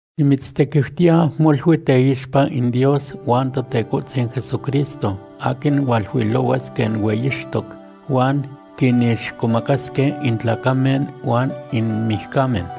Nimitztequiutiya molui teixpa in Dios huan Totecohtzin Jesucristo aquin hualuilohuas quen hueyixtoc huan quinixcomacasque in tlacamen huan in mijcamen,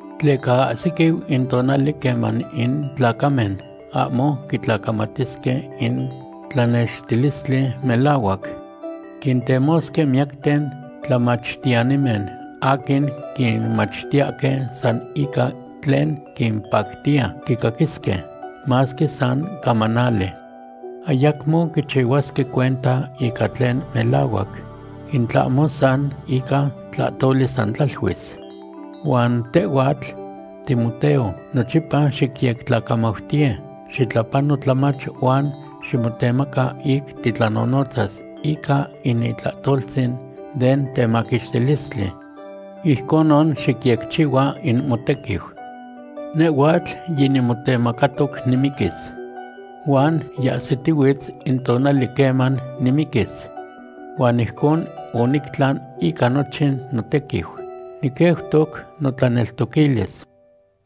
Tleca ahsiquiu in tonali queman in tlacamen ahmo quitlacamatisque in tlanextilistli melahuac. Quintemosque miyacten tlamachtiyanimen aquin quinmachtiyahque san ica tlen quimpactiya quicaquisque, masque san camanali. Ayacmo quichihuasque cuenta ica tlen melahuac, in tlahmo san ica tlahtoli san tlaluis. Huan tehhuatl, Timoteo, nochipa xiyectlamautiye, xitlapano tlamach, huan ximotemaca ic titlanonotzas ica in itlahtoltzin den temaquixtilistli. Ijconon xicyecchihua in motequiu. Nehhuatl yinimotemacatoc nimiquis. Huan yiahsitihuitz in tonali queman nimiquis. Huan ijcon onictlan ica nochin notequiu. Niqueutoc notlaneltoquilis.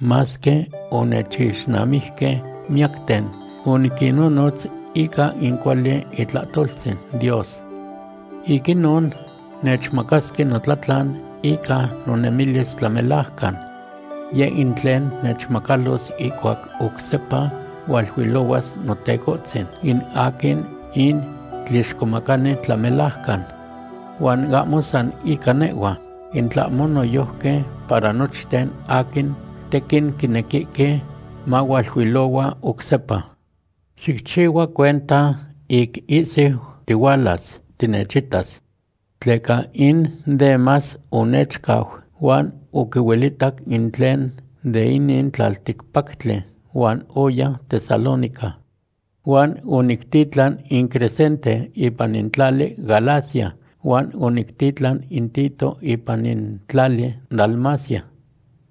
Masque onechixnamijque miyacten, oniquinnonotz ica in cuali itlahtoltzin Dios. Ic inon nechmacasque notlatlan ica nonemilis tlamelajcan. Yeh in tlen nechmacalos ihcuac oc sepa hualuilohuas Notecohtzin, in aquin in tlixcomacani tlamelajcan. Huan ahmo san ica nehhua, in tlahmo noyojqui para nochten aquin tequin quinequihque mahualuilohua oc sepa. Xicchihua cuenta ic ihsiu tihualas tinechitas. Tleca in Demas onechcau huan oquihuelitac in tlen de inin tlalticpactli huan oya Tesalónica. Huan onictitlan in Crescente ipan in tlali Galacia huan onictitlan in Tito ipan in tlali Dalmacia.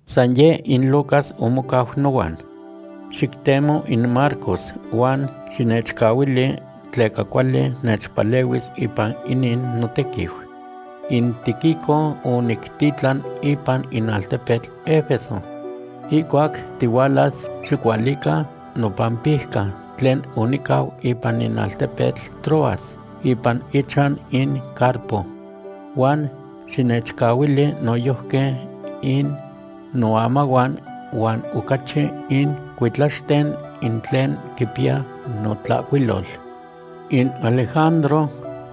San yeh in Lucas omocau nohuan. Xictemo in Marcos huan xinechualiquili, tleca cuali nechpalehuis ipan inin notequiu. In Tíquico onictitlan ipan in altepetl Efeso. Ihcuac tihualas xicualica nopampijca tlen onicau ipan in altepetl Troas ipan ichan in Carpo. Huan xinechualiquili noyojqui in noamahuan huan ocachi in cuitlaxten in tlen quipiya notlahcuilol. In Alejandro,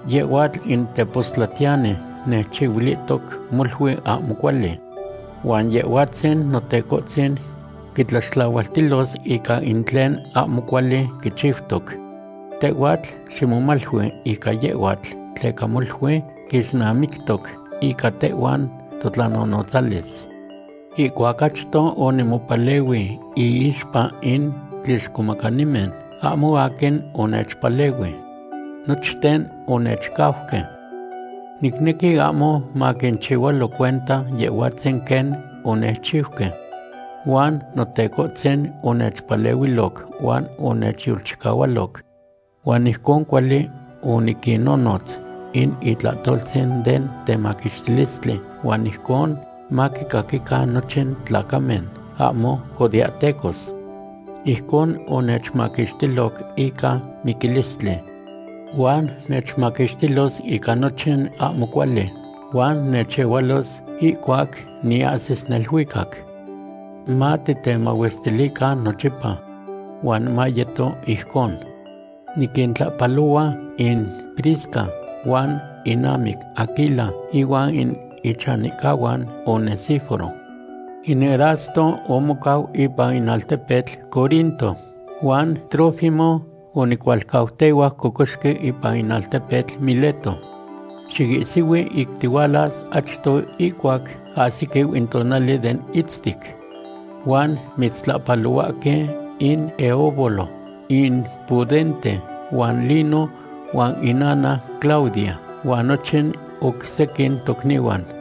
yehhuatl in tepostlatiyani nechchihuilihtoc molui ahmo cuali. Huan Yehhuatzin Notecohtzin quitlaxtlahualtilos ica in tlen ahmo cuali quichiutoc. Tehhuatl ximomalui ica yehhuatl tleca molui quixnamictoc ica tehhuan totlanonotzalis. Ihcuac achto onimopalehui iixpa in tlixcomacanimen, ahmo aquin onechpalehui. Nochten onechcauque. Nicnequi ahmo maquinchihualo cuenta Yehhuatzin quen onechchiuque. Huan Notecohtzin onechpalehuiloc huan onechyolchicahualoc. Huan ijcon cuali oniquinnonotz in itlahtoltzin den temaquixtilistli huan ijcon maquicaquican nochin tlacamen ahmo judeahtecos. Ijcon onechmaquixtiloc ica miquilistli. Huan nechmaquixtilos ica nochin ahmo cuali huan nechehualos ihcuac niahsis neluicac. Matitemahuestilican nochipa. Huan mayeto ijcon. Niquintlahpalohua in Prisca huan inamic Aquila ihuan in ichanihcahuan Onesíforo. In Erasto omocau ipan in altepetl Corinto huan Trófimo onicualcautehuac cocoxqui ipan in altepetl Mileto. Xiihsihui ic tihualas achto ihcuac ahsiquiu in tonali den itztic. Huan mitztlapalohuahque in Eubolo, in Pudente, huan Lino huan inana Claudia, huan nochin oc sequin tocnihuan.